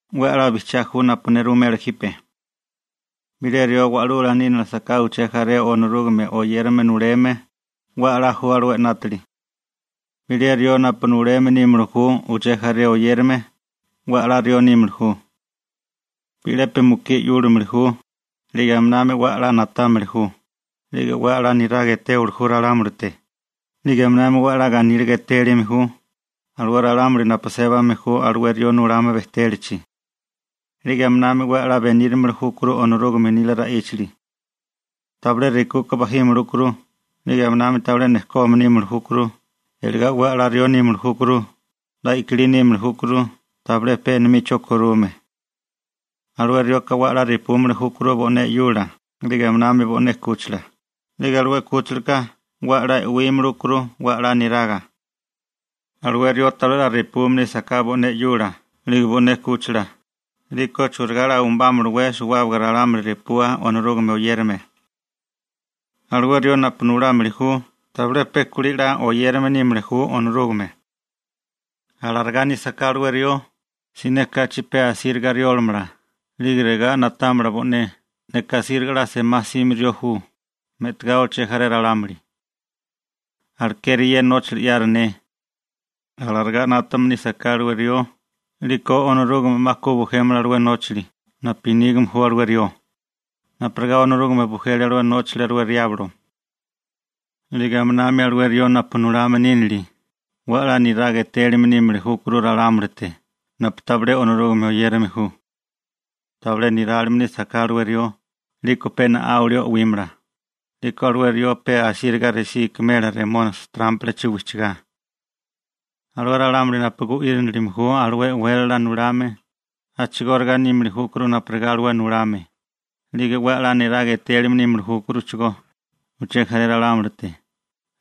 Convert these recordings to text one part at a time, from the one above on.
'We 'la bijchiá ju napu ne ruwimela jipe. Bilé rió wa'lula nínilisaká uché jaré Onorúgame oyérame nuleme, 'we 'la ju alué 'nátali. Bilé rió napu nuleme nímili ju uché jaré oyérame, 'we 'la rió nímili ju. Bi'lepi mukí 'yúlimili ju, 'lige aminami 'we 'la na'támili ju, 'lige 'we 'la niraga etéwili ju ralámulite, 'lige aminami 'we 'la ganíliga etélime ju alué ralámuli napu sébame ju alué rió nulame bejtélachi. 'Lige aminami 'we 'la benírimili júkuru Onorúgame nila ra'íchali. Tabilé rekuka bajímili júkuru, 'lige aminami tabilé nejkome nímili júkuru, iligá 'we 'la rió nímili júkuru, 'la i'kilí nímili júkuru, tabilé pe enomicho korume. Alué rioka 'we 'la repúmili júkuru bo'né 'yula, 'lige aminami bo'né 'kúchila, 'lige alué 'kúchilaka 'we 'la e'wímili júkuru 'we 'la niraga. Alué rió tabilé 'la repume nísaká bo'né 'yula 'lige bo'né 'kúchila, 'liko ¿churigá 'la umbámalawé repua suwábaga ralámuli Onorúgame oyérame? Alué rió napu nulámili ju tabilé pe kulí 'la oyérame nímili ju Onorúgame. Alarigá nísaká alué rió, siné kachi pe asíriga riólimala 'lige regá na'támala bo'né: «Neka asíriga 'la semá 'sime rió ju, me'tagá uché jaré ralámuli. Alekeri ye nóchili 'yaru ne.» Alarigá 'nátame nísaká alué rió 'liko Onorúgame 'ma ku bujémala alué nóchali napu nígame ju alué rió, napurigá Onorúgame bujele alué nóchali alué riablo. 'Lige aminami alué rió napu nulame nínili 'we 'la niraga etélime nímili júkuru ralámulite napu tabilé Onorúgame oyérame ju. Tabilé nirálime nísaká alué rió 'liko pe na'áwili o'wímala, 'liko alué rió pe asíriga resí ikimela Remónisi trámpalachi wijchigá. Alué ralámuli napu gu'írinilime ju alué e'wélala nulame, a'chigóriga nímili júkuru napurigá alué nulame, 'lige 'we 'la niraga etélime nímili júkuruchigó uché jaré ralámulite,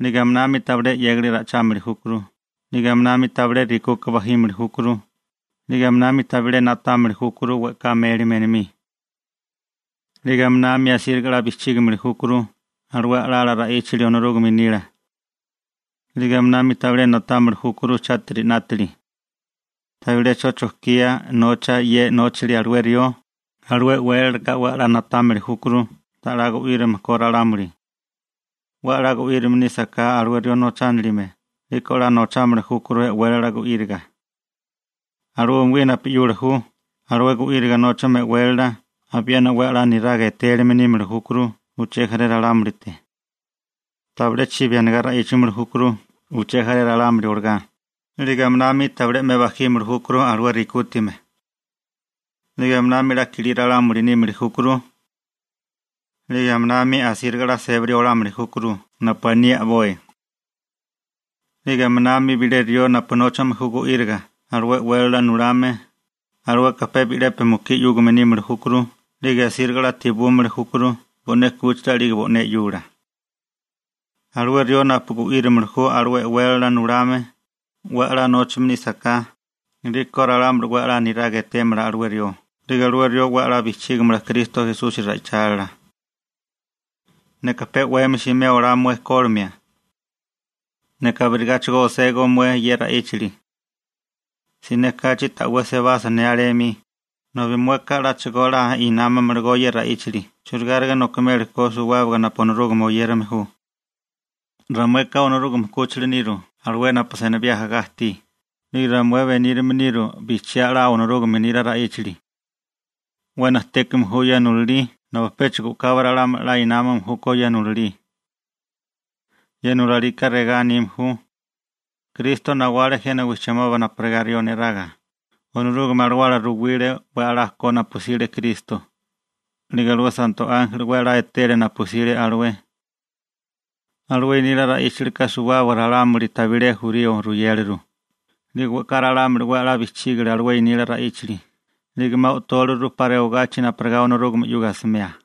'lige aminami tabilé 'yégali ra'ichámili júkuru, 'lige aminami tabilé rekuka bajímili júkuru, 'lige aminami tabilé na'támili júkuru we'ká mélime enomí. 'Lige aminami asíriga 'la bijchígimili júkuru alué a'lala ra'íchali Onorúgame nila. 'Lige aminami tabilé na'támili júkuru chátiri 'nátali. Tabilé 'cho chojkía nocha ye nóchali alué rió, alué e'wélalaka 'we 'la na'támili júkuru ta'lá gu'írame ko ralámuli. 'We a'lá gu'írame nísaká alué rió nochánilime, 'liko 'la nochámili júkuru e'wélala gu'íriga. Alué umugí napu 'yula ju alué gu'íriga nóchame e'wélala abiena 'we 'la niraga etélime nímili júkuru uché jaré ralámulite. Tabilé chibi anigá ra'ichámili júkuru uché jaré ralámuli olagá, 'lige aminami tabilé 'me bajímili júkuru alué rekútame. 'Lige aminami 'la kilí ralámuli nímili júkuru. 'Lige aminami asíriga 'la sébali olámili júkuru napu aní a'boi. 'Lige aminami bilé rió napu nóchame ju gu'íriga alué e'wélala nulame, alueka pe bi'lepi mukí 'yúgame nímili júkuru 'lige asíriga 'la tebúmili júkuru bo'né 'kúchila 'lige bo'né 'yula. Alué rió napu gu'írimili ju alué e'wélala nulame, 'we 'la nóchame nísaká, 'liko ralámuli 'we 'la niraga etémala alué rió, 'lige alué rió 'we a'lá bijchígamala Kristo Esusi ra'ichálila. Neka pe 'wemi simé olá mué kólimia. Neka abirigáchigo oségó mué ye ra'íchali. Siné kachi ta'wé sebasa ne alé 'mi, nobi mueka 'láchigo 'la námamalagó ye ra'íchali churigáriga nokimeli ko suwábaga napu Onorúgame oyérame ju. Ramueka Onorúgame 'kúchila niru alué napu senibí ajagá ajtí, 'lige ramué benírame niru bijchiá 'la Onorúgame nila ra'íchali. 'We najtékame ju ye nulalí nobi péchigo u'kabi ralámuli 'la námame júkó ye nulalí. Ye nulalika regá anime ju: Kristo nawale jena wijchimoba napurigá rió neraga, Onorúgame Alawala ruwile 'we 'la ko napu 'sile Kristo, 'lige alué santo ánjeli 'we 'la etele napu sile alué. Alué nila ra'íchilika suwábaga ralámuli tabilé jurío ruyéliru, 'lige we'ká ralámuli 'we 'la bijchígale alué nila ra'íchali, 'lige 'ma o'tóliru 'pa rewagachi napurigá Onorúgame 'yuga asimea.